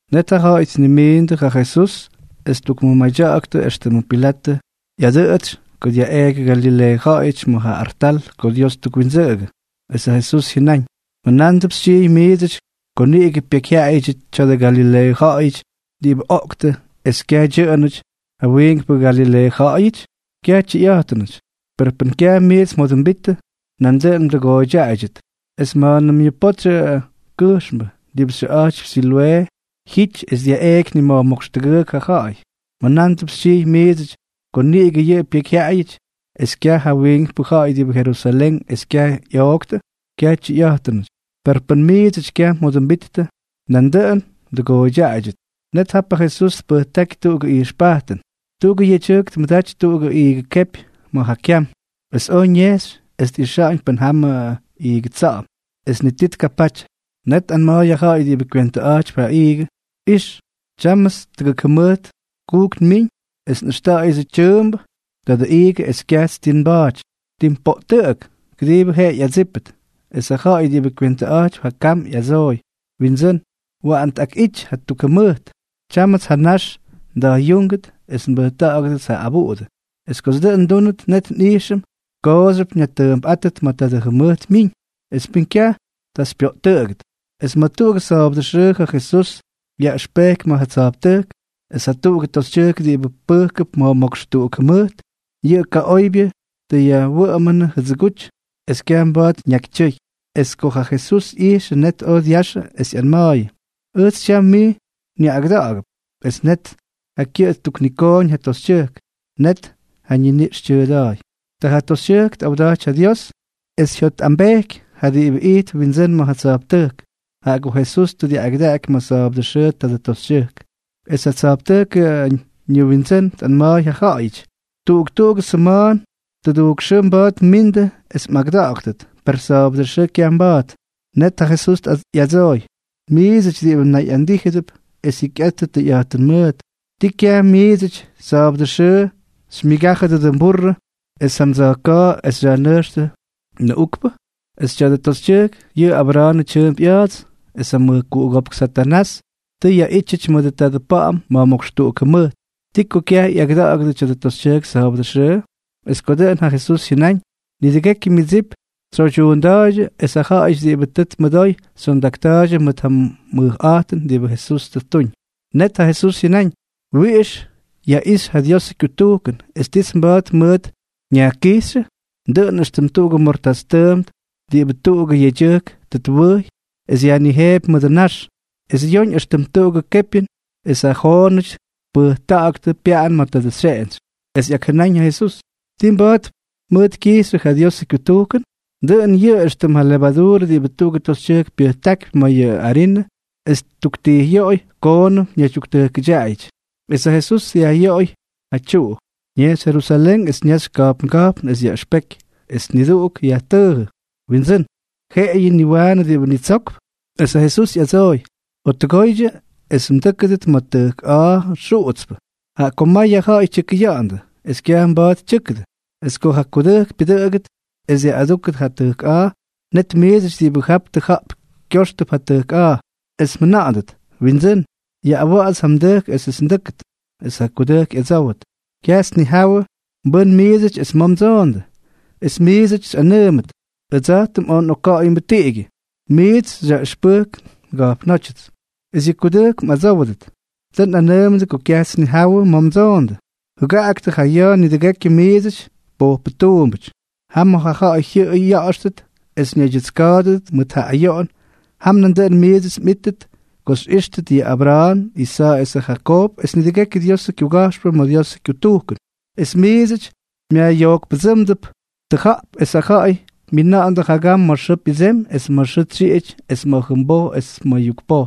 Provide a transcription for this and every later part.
Net ja ja̱ꞌa̱y tnimiindʉ ja Jesús es ttukmʉmadyaktʉ éxtʉmʉ Pilatʉ ꞌyadʉꞌʉtsy ko dyaꞌeeky Galileeʉ ja̱ꞌa̱yʉty ma̱ ja artal ko Dios twindsʉꞌʉgʉdʉ. Es ja Jesús jyʉnáñ: —¿Mjʉnándʉp xytyijy miidsʉty ko niꞌigʉ pyekyjyaꞌayʉdyʉ tya̱dʉ Galileeʉ ja̱ꞌa̱yʉty diꞌibʉ oꞌktʉ es kyaj dyʉꞌʉnʉty ja wiinkpʉ Galileeʉ ja̱ꞌa̱yʉty? Kyaj tyʉyꞌa̱jtʉnʉty. Per pʉn kyaj miits mjodʉmbittʉ, nandʉꞌʉn mdʉgooydyaꞌaydyʉt. Es ma̱a̱nʉm yʉ potsyʉ kʉjxmbʉ diꞌibʉ xyʉꞌa̱jtypy Siloꞌee jyity es dyaꞌeꞌky nima̱jmókx tʉgʉʉk ja ja̱ꞌa̱y, ¿mjʉnándʉp xytyijy miidsʉty ko niꞌigʉ yʉꞌʉ pyekyjyaꞌayʉty es kyaj ja wiinkpʉ ja̱ꞌa̱y diꞌibʉ Jerusalén es kyaj ꞌyoꞌktʉ? ¡Kyaj tyʉyꞌa̱jtʉnʉty! Per pʉn miidsʉty kyaj mjodʉmbittʉ, nandʉꞌʉn mdʉgooydyaꞌaydyʉt. Net ja Jesús tpʉjtáky tuꞌugʉ ijxpajtʉn: —Tuꞌugʉ yedyʉjk tmʉdaty tuꞌugʉ iigʉ kepy ma̱ ja kyam, es oj ñejxy es tꞌixa̱ꞌa̱ñ pʉn jamʉ iigʉ tsa̱ꞌa̱m. Es ni ti tkapaty. Net tꞌanma̱a̱y ja ja̱ꞌa̱y diꞌibʉ kywentʉꞌa̱jtypy ja iigʉ: “Ix. Tyámʉts tʉgʉk jʉmʉjt kujk nmiñ es nꞌʉxta̱ꞌa̱yʉdsʉ tyʉʉmbʉ tadʉ iigʉ es kyajts ti nba̱a̱ty. Tim poꞌtʉꞌʉk. Kʉdiibʉ jeꞌeyʉ ꞌyadsípʉt.” Es ja ja̱ꞌa̱y diꞌibʉ kywentʉꞌa̱jtypy ja kam ꞌyadsooy: “Windsʉ́n, waꞌan tꞌakꞌity jatuk jʉmʉjt. Tyámʉts ja nax nda̱jꞌyúngʉt es mbʉjta̱ꞌa̱gʉdʉts ja abuꞌudʉ. Es kots dʉꞌʉn ndúnʉt, net nꞌijxʉm kooxyʉp nyajtʉʉmpꞌátʉt ma̱ tadʉ jʉmʉjt myiñ. Es pʉn kyaj, ta xypyoꞌtʉꞌʉgʉt.” Es ma̱ tuꞌugʉ sa̱a̱bʉdʉ xʉʉ ja Jesús yaꞌʉxpeky ma̱ ja tsa̱jptʉjk, es ta tuꞌugʉ toxytyʉjk diꞌibʉ pʉjkʉp ma̱jmókx tʉgʉk jʉmʉjt. Yʉ kaꞌoybyʉ tʉ yajwʉꞌʉmʉnʉ jʉdsʉguty, es kyaj mba̱a̱t ñakytyʉy. Es ko ja Jesús ꞌyijxʉ, net oj dyaxʉ es ꞌyanma̱a̱yʉ: —Ʉjts tyam mij nyaꞌꞌagʉda̱ꞌa̱gʉp. Es net ja kyʉꞌʉ ttuknikooñ ja toxytyʉjk, es net ja ñiniꞌx tyʉʉda̱a̱y. Ta ja toxytyʉjk tꞌawda̱jty ja Dios. Es jyotꞌambejky ja diꞌibʉ ijtp windsʉ́n ma̱ ja tsa̱jptʉjk, jaꞌa ko Jesús tʉ dyaꞌꞌagʉdaꞌaky ma̱ sa̱a̱bʉdʉ xʉʉ tadʉ toxytyʉjk. Es ja tsa̱jptʉjkʉ ñʉwindsʉ́n tꞌanma̱a̱y ja ja̱ꞌa̱yʉty: —Tuꞌuk tuꞌugʉ sʉma̱a̱n tʉdujk xʉʉ mba̱a̱t mmindʉ es mꞌagʉda̱ꞌa̱ktʉt, per sa̱a̱bʉdʉ xʉʉ kyaj mba̱a̱t. Net ja Jesús ꞌyadsooy: —Miidsʉty diꞌibʉ nayꞌandíjʉdʉp es jyikyꞌattʉ tʉyꞌa̱jtʉn mʉʉt, ¿ti kyaj miidsʉty sa̱a̱bʉdʉ xʉʉ xymyʉgájʉdʉ mburrʉ es ja mdsa̱jka̱a̱ es xyajnʉjxtʉ nʉꞌukpʉ? Es tya̱dʉ toxytyʉjk yʉꞌʉ Abra̱a̱nʉ tyʉʉmp ꞌya̱a̱ts, es ja mʉjkuꞌugópk Satanás tʉ yaꞌítyʉty mʉdʉ tadʉ pa̱ꞌa̱m ma̱jmókx tʉgʉk jʉmʉjt, ¿ti ko kyaj ꞌyagʉda̱ꞌa̱gʉdʉ tya̱dʉ toxytyʉjk sa̱a̱bʉdʉ xʉʉ? Es ko dʉꞌʉn ja Jesús jyʉnáñ, nidʉgekyʉ myʉdsip tsyoydyuunda̱a̱ydyʉ, es ja ja̱ꞌa̱yʉty diꞌibʉ tʉ tmʉdoy xyondakta̱a̱ydyʉ mʉt ja mʉjꞌa̱jtʉn diꞌibʉ Jesús tʉ ttuñ. Net ja Jesús jyʉnáñ: —¿Wiꞌix yaꞌixy ja Diosʉ kyutujkʉn, es tits mba̱a̱t mʉʉt nyajkijxyʉ? Dʉꞌʉn éxtʉm tuꞌugʉ mortás tʉʉmt diꞌibʉ tuꞌugʉ yedyʉjk tʉ twʉjy es yajnijeepy mʉdʉ nax, es yoñ éxtʉm tuꞌugʉ kepyʉn es ja joonʉty tpʉjta̱ꞌa̱ktʉ pyaꞌan ma̱ tadʉ xyeꞌentsy. Es ꞌyakjʉnáñ ja Jesús: —¿Ti mba̱a̱t mʉt kyijxyʉ ja Diosʉ kyutujkʉn? Dʉꞌʉn yʉꞌʉ éxtʉm ja levaduurʉ diꞌibʉ tuꞌugʉ toxytyʉjk pyʉjtákypy ma̱ mayʉ arinʉ es ttuktijꞌyoꞌoy koonʉm ñaydyuktʉjkʉdyaꞌayʉty. Es ja Jesús dyajꞌyoꞌoy ja tyuꞌu, ñejxy Jerusalén es ñaxy ka̱jpnga̱jpn es yaꞌʉxpeky. Es niduꞌuk yajtʉʉjʉ: —Windsʉ́n, ¿jeꞌeyʉ niwaanʉ diꞌibʉ nitsokp? Es ja Jesús ꞌyadsooy: —Jottʉgoydyʉ es mdʉ́kʉdʉt ma̱ tʉjk a̱a̱ xuꞌutspʉ, jaꞌa ko may ja ja̱ꞌa̱y tyʉkʉya̱ꞌa̱ndʉ, es kyaj mba̱a̱t tyʉ́kʉdʉ. Es ko ja kudʉjk pyʉdʉꞌʉgʉt es dyaꞌꞌadúkʉt ja tʉjk a̱a̱, net miidsʉty diꞌibʉ jap tʉja̱ꞌp kyóxtʉp ja tʉjk a̱a̱, es mjʉna̱ꞌa̱ndʉt: “Windsʉ́n, yaꞌꞌawa̱ꞌa̱ts ja mdʉjk esʉts ndʉ́kʉdʉt.” Es ja kudʉjk ꞌyadsówʉt: “Kyajts nnijawʉ mbʉ́n miidsʉty es ma̱ mdsoondʉ.” Es miidsʉty xyꞌanʉʉmʉt: “Ʉdsa̱jtʉm oj nꞌokka̱ꞌa̱yʉmbʉ tiꞌigyʉ, es mijts xyaꞌʉxpʉjk nga̱jpnótyʉts.” Es yʉ kudʉjk mꞌadsówʉdʉt: “Tʉ nꞌanʉʉmʉdʉ ko kyajts nnijawʉ ma̱ mdsoondʉ. ¡Jʉgaꞌaktʉ ja ya̱a̱ nidʉgekyʉ miidsʉty pojpʉ tuumbʉty!” Jam ma̱ ja̱ꞌa̱y jyʉꞌʉy ya̱ꞌa̱xtʉt es ñaydyʉtska̱a̱dʉdʉt mʉt ja ayoꞌon, jam nandʉꞌʉn miits mꞌíttʉt ko xyꞌíxtʉt yʉ Abra̱a̱n, Isa̱a̱ esʉ Jakoob es nidʉgekyʉ Diosʉ kyuga̱jxpʉ ma̱ Diosʉ kyutujkʉn, es miits myajꞌyojkpʉdsʉmándʉp tʉja̱ꞌp. Es ja ja̱ꞌa̱y myina̱ꞌa̱ndʉ jagam ma̱ xʉʉ pyʉdsemy es ma̱ xʉʉ tsyiꞌity es ma̱ jʉmboj es ma̱ yukpoj,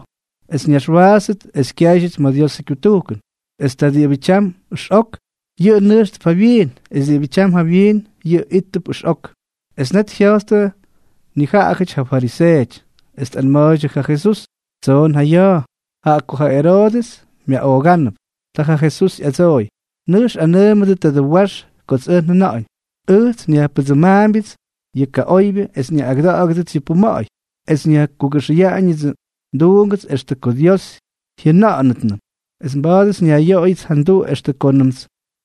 es ñaxwaatstʉt es kyáydyʉt ma̱ Diosʉ kyutujkʉn. Es ta diꞌibʉ tyam ʉxꞌok, yʉꞌʉ nʉjxtʉp jawyiin; es diꞌibʉ tyam jawyiin, yʉꞌʉ íttʉp ʉxꞌok. Es net jya̱jttʉ nijaꞌajʉty ja fariseeʉty, es tꞌanma̱a̱ydyʉ ja Jesús: —Tsoon ja ya̱a̱, jaꞌa ko ja Eroodʉs myaꞌoogánʉp. Ta ja Jesús ꞌyadsooy: —Nʉjx anʉʉmʉdʉ tadʉ wax kots ʉj njʉna̱ꞌa̱ñ: “Ʉjts nyajpʉdsʉmaambyʉts yʉ kaꞌoybyʉ es nyaꞌꞌagʉda̱ꞌa̱gʉdʉts yʉ puma̱ꞌa̱y, es nyajkʉxa̱ꞌa̱ñʉts yʉ nduungʉts extʉ ko Dios jyʉna̱ꞌa̱nʉtnʉm.” Es mba̱a̱dʉts nyajꞌyoꞌoyʉdʉts ja nduꞌu extʉ koonʉmts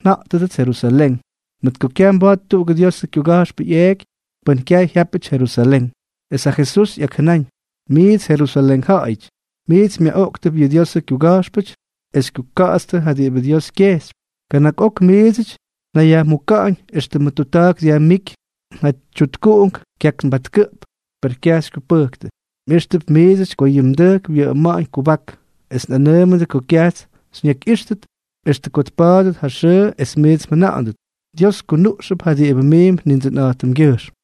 nja̱ꞌtʉdʉts Jerusalén. Mʉt ko kyaj mba̱a̱t tuꞌugʉ Diosʉ kyuga̱jxpʉ ꞌyeeky pʉn kyaj jyápʉty Jerusalén. Es ja Jesús ꞌyakjʉnáñ: —Miits Jerusalén ja̱ꞌa̱yʉty, miits myaꞌoꞌktʉp yʉ Diosʉ kyuga̱jxpʉty es xykyuka̱ꞌa̱tstʉ ja diꞌibʉ Dios kyejxypy. Kana̱k ok miidsʉty njayajmuka̱ꞌa̱ñ éxtʉmʉ tutta̱a̱k dyajmíky ja tyutkuꞌungʉty kyaknbatkʉꞌp, per kyaj xykyupʉjktʉ. Mꞌíxtʉp miidsʉty ko yʉ mdʉjk wyʉꞌʉma̱ꞌa̱ñ kubak. Es nꞌanʉʉmʉdʉ ko kyajts xyñakyꞌíxtʉt extʉ ko tpa̱a̱dʉt ja xʉʉ es miits mjʉna̱ꞌa̱ndʉt: “Dios kyunuꞌxʉp ja diꞌibʉ miimp Nindsʉnꞌa̱jtʉmgyʉjxm.”